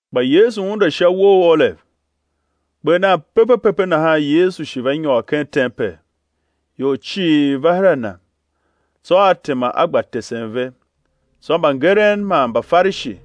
[ Kpa Yesu unde sha uwo u Olev. Kper nan pepe pepe nahan Yesu shi va nyôr ken tempel, ior cii va her a Na; tsô A tema A gba tesen ve. Tsô mbangeren man Mbafarishi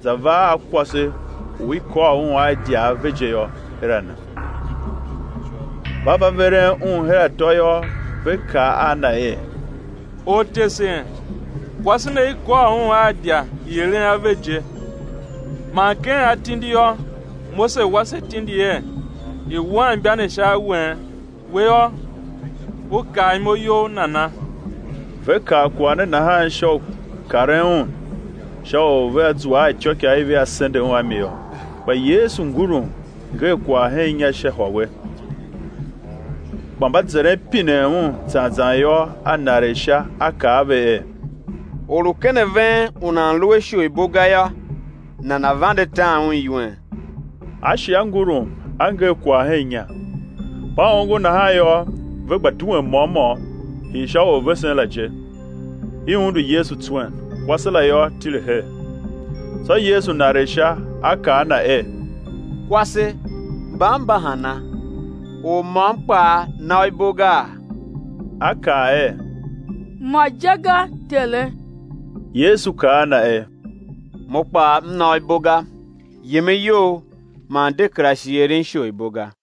za va a kwase u i kôr un a idya ave je yô, her a Na. Mba va veren un her atô yô, ve kaa a Na er: Ortesen kwase ne i kôr un a idya i eren ave je; man ken atindi yô, Mose wa se tindi er, i̱ wuan imba ne sha awen; We yô, U kaa imo You nana? Ve kaa kwagh ne nahan sha u karen Un, sha u vea zua a ityôikaa i vea sende Un a mi yô. Kpa Yesu ngurum, nger kwagh hen inya sha hôwe. Kpa mba zeren pinen Un zan zan yô, A naregh sha, A kaa a ve er: Or u ken a ven u nan lu a isholibo ga yô, nana̱ vande tan un iwen. A shi a ngurum, A nger kwagh hen inya. Mba ongo nahan yô, ve gba duen môm môm, hii sha orvesen la je, i undu Yesu tswen, kwase la yô, tile her. Tsô Yesu naregh sha, A kaa a na er: Kwase, mban mba hana? Or môm kpaa na u ibo gaa? A kaa er: Mo je ga,Tere. Yesu kaa a na er: Mo kpaa M na u ibo ga; yem a you, man de kera shi eren isholibo ga.]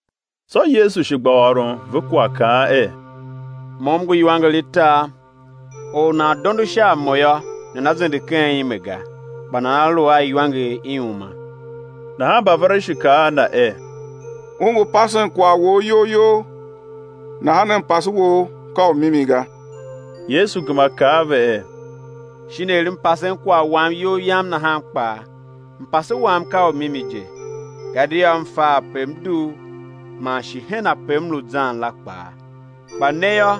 Tsô Yesu shi gba ôron ve kwagh, kaan er: Mo M ngu iwanger i tar; or u nan dondo sha a Mo yô, nana zende ken ime ga, kpa nana lu a iwanger i uma. Nahan Mbafarishi kaa a Na er: U ngu pasen kwagh Wou iyol You nahan mpase Wou ka u mimi ga. Yesu gema kaa a ve er: Shin er M pasen kwagh Wam iyol Yam nahan kpaa, mpase Wam ka u mimi je; gadia M fa ape M dugh, man shi hen ape M lu zan la kpaa; kpa ne yô,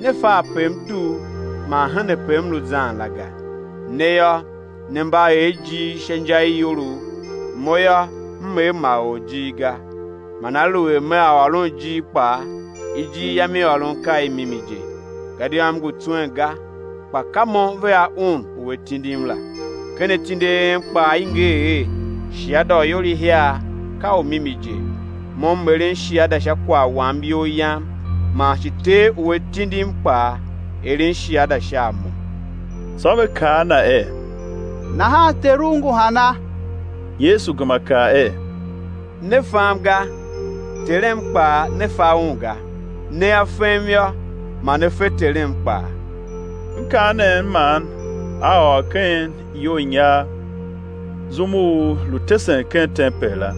ne fa ape M dugh man hen ape M lu zan la ga. Ne yô, ne mba er ijir sha inja i iyolough, Mo yô, M er ma or ijir ga. Man aluer Mea ôron ijir je kpaa, ijir Yam i ôron ka i mimi je, gadia M ngu tswen ga kpa ka Mo vea Un u A tindim la. Ken atindi a en kpaa i nger er, shiada u ior ihiar ka u mimi je; Mo M eren shiada sha kwagh Wam iyol Yam, man shi Ter u A tindim kpaa, eren shiada sha a Mo. Tsô ve kaa a Na er: Nahan Teru ngu hana? Yesu gema kaa er: Ne fam ga, Terem kpaa ne fa Un ga; nea fem yô, ma ne fe Terem kpaa. Mkaanem man A ôr ken iyounyar zum u lu tesen ken tempel la.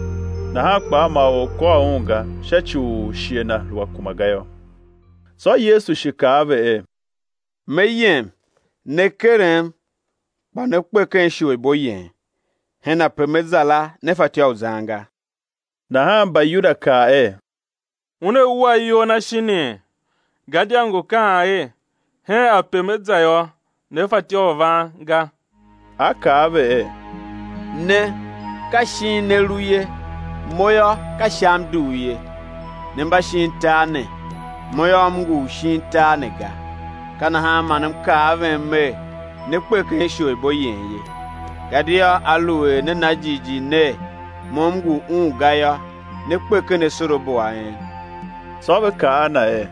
Nahan kpaa ma or kôr Un ga, sha ci u shighe Na lu a kuma ga yô. Tsô Yesu shi kaa a ve er: Me yem, né kerem, kpa né kpe ken isholibo yen; hen ape Me za la, ne fatyô u zan ga. Nahan Mbayuda kaa er: Una wua iyol Na, shinii? Gadia ngu kaan er: Hen ape Me za yô, ne fatyô u van ga. A kaa a ve er: Ne, ka shin ne lu ye; Mo yô, ka Sha M dugh ye; ne mba shin tar ne; Mo yô, M ngu u shin tar ne ga. Ka nahan man M kaa a ven Mer: Né kpe ken isholibo yen ye; gadia aluer ne na jighjigh ner, Mo M ngu Un ga yô, né kpe ken asorabo a en. Tsô ve kaa a Na er: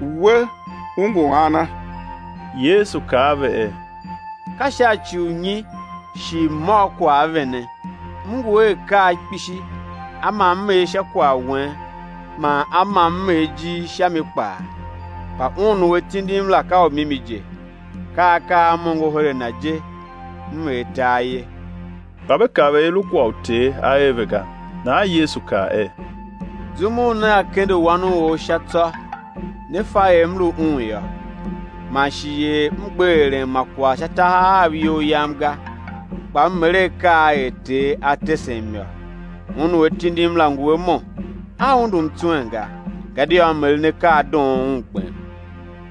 We U ngu ana? Yesu kaa a ve er: Ka sha ci u nyi shi M̱ ôr kwagh a vene? M ngu a akaa kpishi a ma M er sha kwagh wen man a ma M er ijir sha mi kpaa, kpa Un u A tindim la ka u mimi je; ka akaa a M ongo her a Na je M er tar ye. Kpa ve kav er i lu kwagh u Ter A er ve ga. Nahan Yesu kaa er: Zum u nea kende Wan u or sha tsô né fa er M lu Un yô, man shi er M gbe eren ma kwagh sha tahav Av iyol Yam ga, kpa M er akaa er Ter a tesem yô. Un u A tindim la ngu a Mo; A undum tswen ga, gadia M eren akaa a doon Un gbem.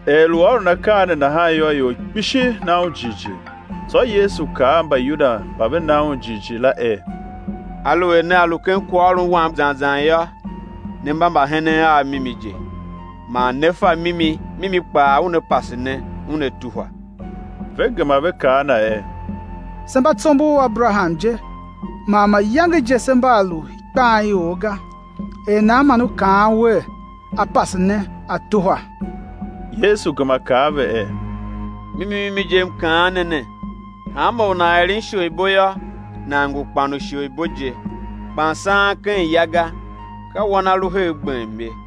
Er lu ôron akaa ne nahan yô, ior kpishi na Un jighjigh. Tsô Yesu kaa a Mbayuda mba ve na Un jighjigh la er: Aluer nea lu ken kwaghôron Wam zan zan yô, ne mba mbahenen Av mimi je; man né fa mimi, mimi kpaa una pase ne una tuhwa. Ve gema ve kaa a Na er: Se mba tsombor u Aberaham je, man mayange je se mba a lu ikpan i or ga; er nan man U kaan Wer: á pase ne á tuhwa? Yesu gema kaa a ve er: Mimi mimi je, M kaan ne ne, hanma or u nan eren isholibo yô, nan ngu kpan u isholibo je. Kpan saan ken ya ga, ka wan a lu her gbem ye.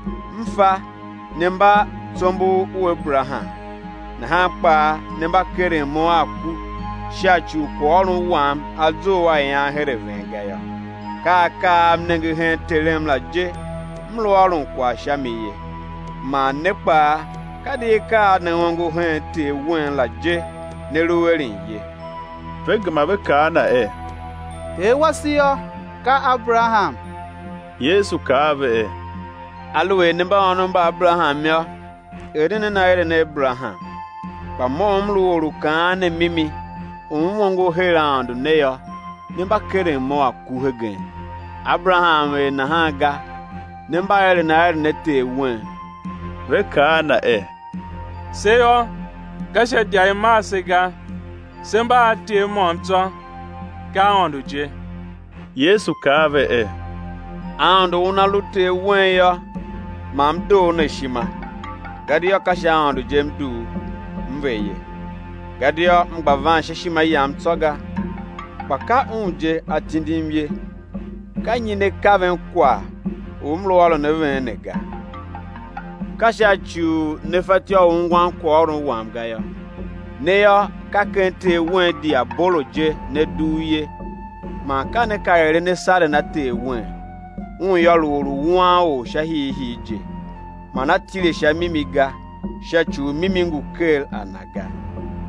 M fa ne mba tsombor u Aberaham; nahan kpaa ne mba keren Mo a ku sha ci u kwaghôron Wam a zough a ian her a ven ga yô. Ka akaa a M nenge hen Terem la je M lu ôron kwagh sha mi ye; man ne kpaa ka di akaa a ne ongo hen ter wen la je ne lu eren ye. Ve gema ve kaa a Na er: Ter wase yô, ka Aberaham. Yesu kaa a ve er: Aluer ne mba ônov mba Aberaham yô, eren nen aeren a Aberaham. Kpa Mo u M lu Or u kaan ne mimi u M ongo her Aôndo ne yô, ne mba keren Mo a ku hegen; Aberaham er nahan ga. Ne mba eren aeren a ter wen. Ve kaa a Na er: Se yô, ka sha idya i mar se ga; se mba a Ter môm tsô, ka Aôndo je. Yesu kaa a ve er: Aôndo Una lu Ter wen yô, ma M doo ne ishima, gadia ka sha Aôndo je M dugh, M ve ye, gadia M gba van sha ishima Yam tsô ga, kpa ka Un je A tindim ye. Ka nyi ne kaven kwagh u M lu ôron a ven ne ga? Ka sha ci u ne fatyô u ungwan kwaghôron Wam ga yô. Ne yô, ka ken ter wen diabolo je ne dugh ye, man ka ne ka eren asaren a ter wen; un yô lu orwuanor sha hiihii je, man a tile sha mimi ga sha ci u mimi ngu ker a na ga.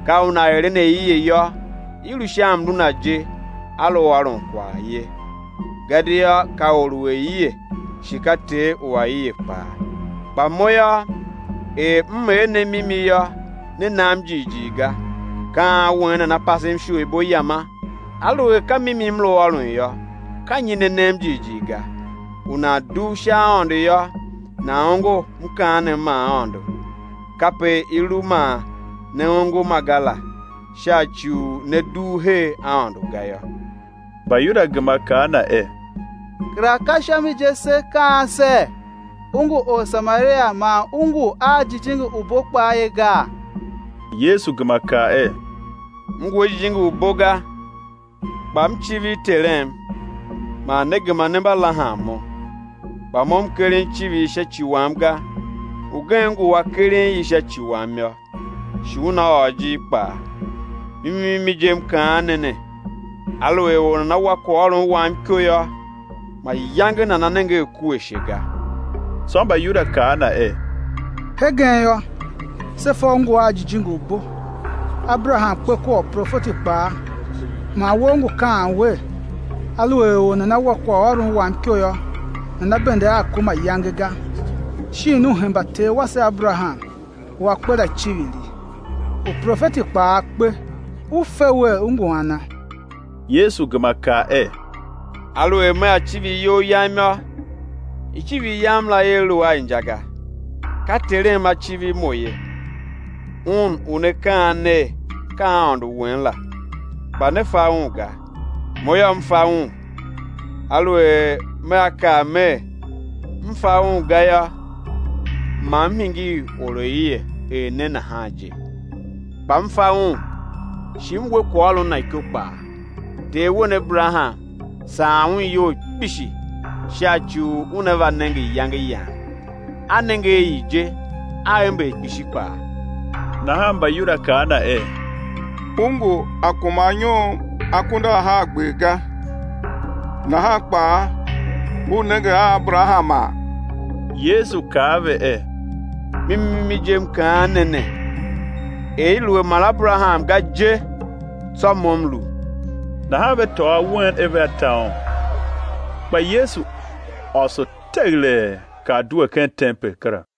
Ka una eren aie yô, i lu sha mlu na je a lu ôron kwagh ye; gadia ka or u aie shi ka ter u aie kpaa. Kpa Mo yô, er M er ne mimi yô, ne nam jighjigh ga. Ka an wen nana pasem isholibo Yama? Aluer ka mimi M lu ôron yô, ka nyi ne nem jighjigh ga? U nan dugh sha Aôndo yô, nan ongo mkaanem ma Aôndo; kape i lu man ne ongo ma ga la, sha ci u ne dugh her Aôndo ga yô. Mbayuda gema kaa a Na er: Kera ka sha mi je se kaan ser, U ngu Orsamaria man U ngu a jijingi u bo kpaa ye gaa? Yesu gema kaa er: M ngu a jijingi u bo ga, kpa M civir Terem, man ne gema ne mba lahan Mo. Kpa Mo M keren icivir sha ci Wam ga; Ugen ngu u A keren i sha ci Wam yô, shi Una ôr ijir kpaa. Mimi mimi je, M kaan ne ne, aluer or nana wa kwaghôron Wam iko yô, mayange nana nenge a ku ashe ga. Tsô Mbayuda kaa a Na er: Hegen yô, se fa U ngu a jijingi u bo; Aberaham kpe kua uprofeti kpaa; man We U ngu kaan wer: Aluer or nana wa kwaghôron Wam iko yô, nana bende a ku mayange ga. Shin U hemba ter wase Aberaham, u a kpe la icivir? Uprofeti kpaa kpe; U fe Wer, U ngu ana? Yesu gema kaa er: Aluer Mea civir iyol Yam yô, icivir Yam la ia lu a inja ga; ka Terem A civir Mo ye, Un u ne kaan ner, ka Aôndo wen la. Kpa ne fa Un ga; Mo yô, M fa Un; aluer Mea kaa Mer; M fa Un ga yô, ma M hingir oraie er ne nahan je; kpa M fa Un, shi M we kwaghôron Na iko kpaa. Ter wen, Aberaham, saan un iyol kpishi sha ci u una va nenge iyange Yam; a nenge a i je, a ember kpishi kpaa. Nahan Mbayuda kaa a Na er: U ngu a kuma anyom akunduahargber ga, nahan kpaa U nenge Aberahama? Yesu kaa a ve er: Mimi mimi je, M kaan ne ne, er i lu a mar Aberaham ga je, tsô Mo M lu. Nahan ve tôô awen er vea ta Un; kpa Yesu ôso teghelee kar due ken tempel kera.